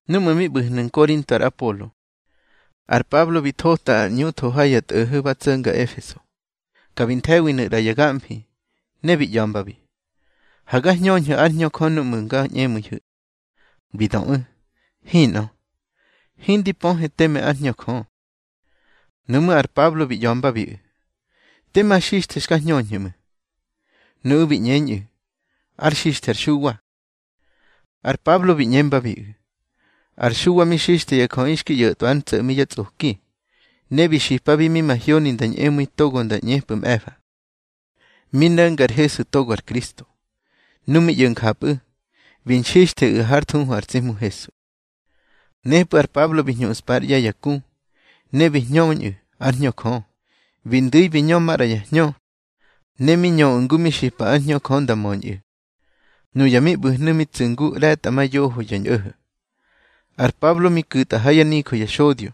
Núꞌmu̱ mi ꞌbu̱hnu̱ Nkorinto ar Apolo, ar Pablo bi thota ar ꞌñu tho ha ya tꞌo̱ho̱ ba tso̱nga Efeso. Ka bi nthe̱winu̱ ꞌra ya gamfi. Ne bi ꞌya̱mbabi: —Ha ga hñöñhu̱ ár Hñö Jö núꞌmu̱ nga ñꞌemu̱ihu̱. Bi döꞌu̱: —Hinꞌö, hindi pöhe teme ár Hñö Jö. Nuꞌmú̱ ar Pablo bi ꞌya̱mbabiꞌu̱: —Tema xixthe xka hñöñhu̱ ꞌmu̱. Nuꞌu̱ bi ꞌñeñꞌu̱: —Ár xixthe ar Xuwa. Ar Pablo bi ꞌñembabiꞌu̱: —Ar Xuwa mi xixthe ya jöꞌi xki ꞌyo̱tꞌwa ár ntso̱ꞌmi yá tsꞌoki. Ne bi xipabi mi mahyoni nda ñꞌemu̱i togo nda ꞌñepꞌu̱ mꞌe̱fa. Mi no̱nga ar Hesu togo ar Kristo. Nu mi ꞌyo̱ njapꞌu̱, bi nxixtheꞌu̱ hár thuhu ar tsi Hmu Hesu. Nepꞌu̱ ar Pablo bi hñuꞌspa ár ꞌye̱ ya ku, ne bi hñöñꞌu̱ ár Hñö Jö. Bi ndu̱i bi ñö maꞌra ya hñö, ne mi ñöꞌu̱ ngu mi xipa ár Hñö Jö nda möñꞌu̱. Nuya mi ꞌbu̱hnu̱ mi tsu̱ ngu ꞌre̱tꞌamayoho ya ñꞌo̱ho̱. Ar Pablo mi ku̱tꞌa ha yá nijö ya xodyo.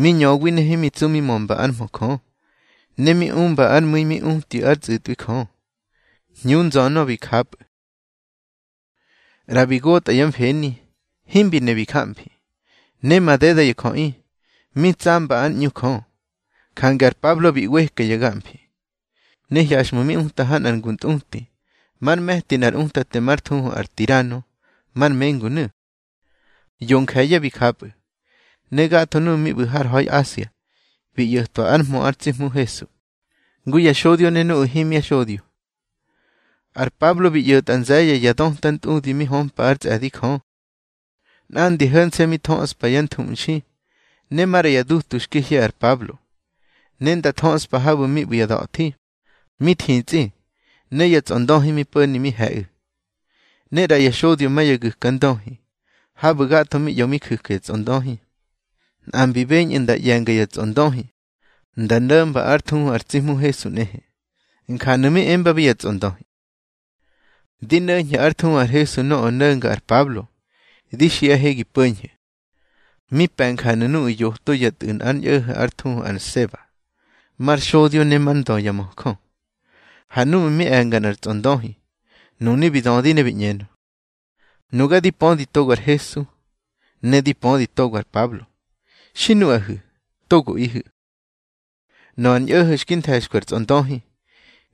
Mi ñöwi ne himi ntsu mi mömba ár mhö Jö, ne mi umba ár mu̱i mi utyu̱ ár tsꞌu̱tꞌwi Jö. Hñu nzönö bi japꞌu̱. ꞌRa bi gotꞌa yá mfeni, himbi ne bi jamfi, ne madeda ya jöꞌi, mi tsamba ár ꞌñu Jö. Jange ar Pablo bi ꞌweka ya gamfi, ne hyaxꞌmu̱ mi uta ha nꞌar ngu ntꞌuti, már me̱ti nꞌar utate már thuhu ar Tirano, mar mengunu̱. Yo nje̱ye̱ bi japꞌu̱, ne gatho nuꞌu̱ mi ꞌbu̱ har ha̱i Asia bi ꞌyo̱twa ár mhö ar tsi Hmu Hesu, ngu ya xodyo ne nuꞌu̱ himya xodyo. Ar Pablo bi ꞌyo̱tꞌa nze̱ye̱ ya döta ntꞌudi mi hömpa ár tsꞌe̱di Jö. Nꞌandi ho̱nse̱ mi thöꞌspa yá nthuꞌmxi ne maꞌra yá dutu xki hye ar Pablo, ne nda thöꞌspa habu̱ mi ꞌbu̱ ya da̱thi, mi thitsꞌi, ne ya tsꞌondöhi mi po̱ni mi he̱ꞌu̱. Ne ꞌra ya xodyo ma ya gu̱ka ndöhi, habu̱ gatho mi ꞌyo mi ju̱ka ya tsꞌondöhi, nꞌa mbi beñꞌu̱ nda ꞌye̱nga ya tsꞌondöhi nda no̱mba ár thuhu ar tsi Hmu Hesu nꞌehe. Njanu̱ mi embabi ya tsꞌondöhi: —Di no̱ñhe ár thuhu ar Hesu nöꞌö no̱nga ar Pablo, di xiꞌahe gi po̱ñhu̱. Mi pe̱ njanu̱ nuꞌu̱ yoto yá tꞌu̱ nꞌar ñꞌo̱ho̱ már thuhu ar Seba, mar xodyo ne már ndö ya möjö. Ha núꞌmu̱ mi e̱nga nꞌar tsꞌondöhi, nunu̱ bi dödi ne bi ꞌñenö: —Nuga di pödi togo ar Hesu, ne di pödi togo ar Pablo. Xi nuꞌahu̱, togoꞌihu̱. Nöꞌö ar ñꞌo̱ho̱ xki nthe̱xkwi ar tsꞌondöhi,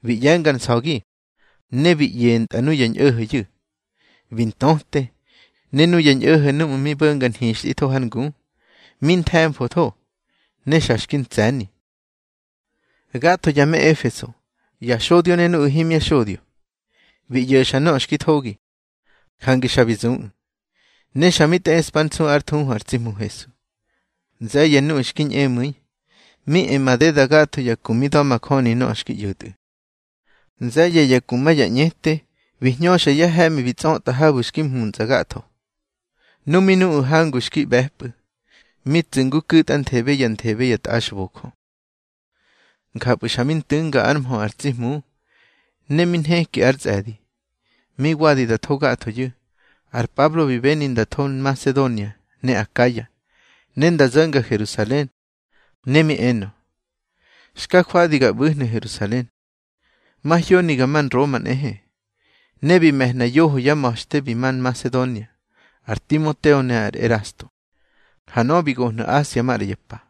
bi ꞌye̱ngar nsa̱gi ne bi ꞌyentꞌa nuya ñꞌo̱ho̱yu̱. Bi ntöte, ne nuya ñꞌo̱ho̱ núꞌmu̱ mi bo̱nga nhixtꞌitho har ngu, mi nthe̱mfotho, ne xa xki ntsꞌe̱ni. Gatho ya me Efeso, ya xodyo ne nuꞌu̱ himya xodyo, bi ꞌyo̱xa nöꞌö xki thogi, jange xa bi zuꞌu̱, ne xa mi tꞌeꞌspár nsu ár thuhu ar tsi Hmu Hesu. Nze̱ye̱ nuꞌu̱ xki ñꞌemu̱i mi e madeda gatho ya ku mi da̱majöni nöꞌö xki ꞌyo̱tꞌu̱. Nze̱ye̱ ya ku ma ya ñꞌete bi hñöxa yá he̱ꞌmi bi tsꞌötꞌa habu̱ xki mhuntsꞌa gatho. Nu mi nuꞌu̱ hangu xki ꞌbe̱pꞌu̱, mi tsu̱ ngu ku̱tꞌanthebe ya nthebe ya tꞌaxbojö. Njapꞌu̱ xa mi ntu̱nga ár mhö ar tsi Hmu ne mi nheki ár tsꞌe̱di. Mi wadi da tho gathoyu̱, ar Pablo bi beni nda tho Nmasedonia ne Akaya, ne nda zo̱nga Herusalen. Ne mi enö: —Xka jwadi ga ꞌbu̱hnu̱ Herusalen, mahyoni ga ma Nroma nꞌehe. Ne bi me̱hna yoho yá ma̱xte bi ma Nmasedonia, ar Timoteo ne ar Erasto. Ha nöꞌö bi gohnu̱ Asia maꞌra ya pa.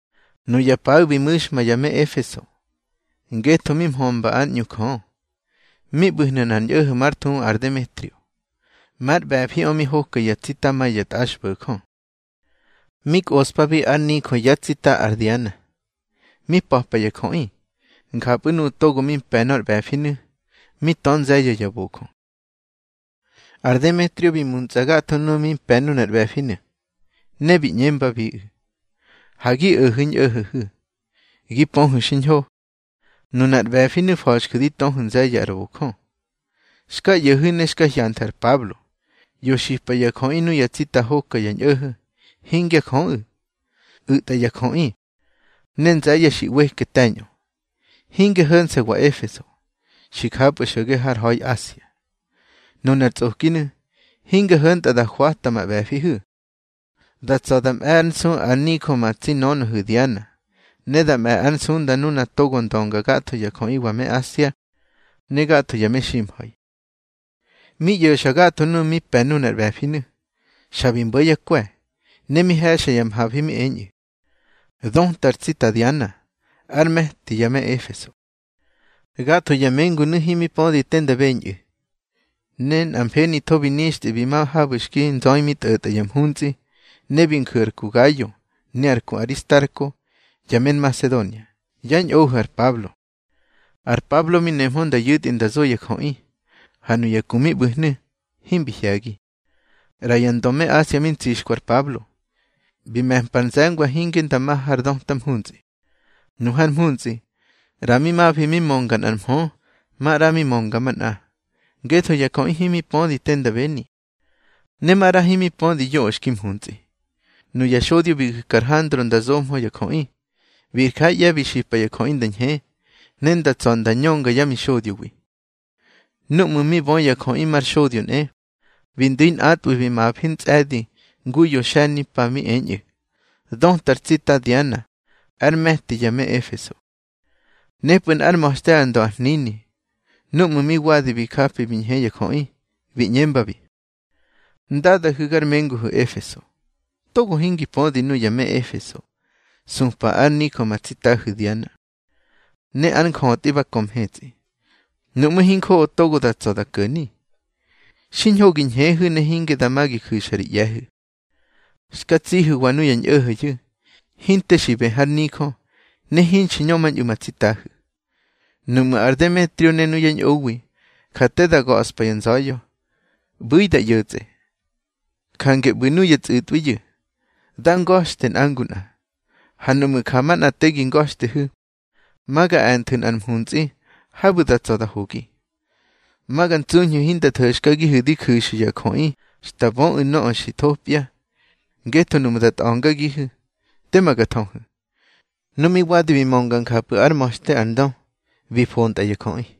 Nuya paꞌu̱ bi mu̱xma ya me Efeso, ngetho mi mhömba ár ꞌñu Jö. Mi ꞌbu̱hnu̱ nꞌar ñꞌo̱ho̱ mar thuhu ar Demetrio. Már ꞌbe̱fiꞌö mi hoka ya tsita ma ya tꞌaxbo̱jö. Mi kꞌoꞌspabi ár nijö yá tsita ar Diana, mi pa̱pa ya jöꞌi. Njapꞌu̱ nuꞌu̱ togo mi mpe̱ nor ꞌbe̱finu̱, mi tö nze̱ye̱ ya bojö. Ar Demetrio bi muntsꞌa gatho nuꞌu̱ mi pe̱ nunar ꞌbe̱finu̱, ne bi ꞌñembabiꞌu̱: —Ha gi o̱hu̱ ñꞌo̱ho̱hu̱. Gi pöhu̱ xiñho, nunar ꞌbe̱finu̱ fa̱xju̱ di töhu̱ nze̱ye̱ ar bojö. Xka ꞌyo̱hu̱ ne xka hyanthu̱ ar Pablo, ꞌyo xipa ya jöꞌi nuya tsita hoka ya ñꞌo̱ho̱, hingya jöꞌu̱. U̱tꞌa ya jöꞌi, ne nze̱ye̱ xi ꞌweke te̱ñꞌö, hinge ho̱nse̱wa Efeso, xi japꞌu̱ xo̱ge har ha̱i Asia. Nunar tsꞌokinu̱, hinge ho̱ntꞌa da hwata ma ꞌbe̱fihu̱. Da tsa̱ da mꞌe̱ ár nsu ár nijö ma tsi nönöhu̱ Diana, ne da mꞌe̱ ár nsunda nuna togo ndönga gatho ya jöꞌiwa me Asia, ne gatho ya meximha̱i. Mi ꞌyo̱xa gatho nuꞌu̱ mi pe̱ nunar ꞌbe̱finu̱, xa bi mbo̱ yá kwe̱, ne mi he̱xa ya mhafi, mi eñꞌu̱: —Döta ar tsita Diana, ár me̱ti ya me Efeso. Gatho ya mengunu̱ himi pödi te nda beñꞌu̱, ne nꞌa mfenitho bi nixtꞌi bi ma habu̱ xki nzöi mi tꞌo̱tꞌa ya mhuntsꞌi. Ne bi nju̱ ar ku Gayo ne ar ku Aristarko, ya me Nmasedonia, yá ñꞌohu̱ ar Pablo. Ar Pablo mi nehmö nda yu̱tꞌi nda zo ya jöꞌi, ha nuya ku mi ꞌbu̱hnu̱ himbi hye̱gi. ꞌRa ya ndö me Asia mi ntsixkwi ar Pablo, bi me̱mpa ar nze̱ngwa hinge nda ma har döta mhuntsꞌi. Nu har mhuntsꞌi, ꞌra mi mafi mi mönga nꞌar mhö, maꞌra mi mönga manꞌa, ngetho ya jöꞌi himi pödi tema nda beni, ne maꞌra himi pödi yoꞌö xki mhuntsꞌi. Nuya xodyo bi gu̱ka ar Handro nda zohmö ya jöꞌi. Bi jár ꞌye̱ bi xipa ya jöꞌi nda ñhe, ne nda tsa̱ nda ñönga yá mixodyowi. Núꞌmu̱ mi bö ya jöꞌi mar xodyo nꞌe, bi ndu̱i nꞌatꞌwu̱ bi mafi ntsꞌe̱di ngu yo xe̱nimpa, mi eñꞌu̱: —Döta ar tsita Diana ár me̱ti ya me Efeso. Nepꞌu̱ nꞌár ma̱xte ár ndö ar hnini, núꞌmu̱ mi wadi bi japi bi ñhe ya jöꞌi, bi ꞌñembabi: —Ndadahu̱ gar menguhu̱wa Efeso, togo hingi pödi nuya me Efeso supa ár nijö ma tsitahu̱ Diana, ne ár njötꞌi ba kö mhetsꞌi. Nuꞌmu̱ hinjoꞌo togo da tsa̱ da ko̱ni, xiñho gi ñheꞌu̱ ne hinge dama gi ju̱xa ri ꞌye̱hu̱. Xka tsihu̱wa nuya ñꞌo̱ho̱yu̱ hinte xi bë har nijö, ne hinxi ñömañꞌu̱ ma tsitahu̱. Nuꞌmu̱ ar Demetrio ne nuyá ñꞌowi ja te da ga̱ꞌspa ya nza̱ya̱, ꞌbu̱ꞌu̱ da ꞌyo̱tsꞌe. Jange ꞌbu̱ nuya tsꞌu̱tꞌwiyu̱, dá nga̱xte nꞌa ngu nꞌa. Ha nuꞌmu̱ ja manꞌa te gi nga̱xtehu̱, ma ga e̱nthu̱ nꞌar mhuntsꞌi habu̱ da tsa̱ da hogi. Ma ga ntsuñhu̱ hinda tho̱xkagihu̱ di ju̱xu̱ ya jöꞌi xta böꞌu̱ nöꞌö xi thopya, ngetho nuꞌmu̱ da tꞌa̱ngagihu̱, tema ga thöhu̱. Nu mi wadi bi mönga njapꞌu̱ ár ma̱xte ar ndö, bi fontꞌa ya jöꞌi.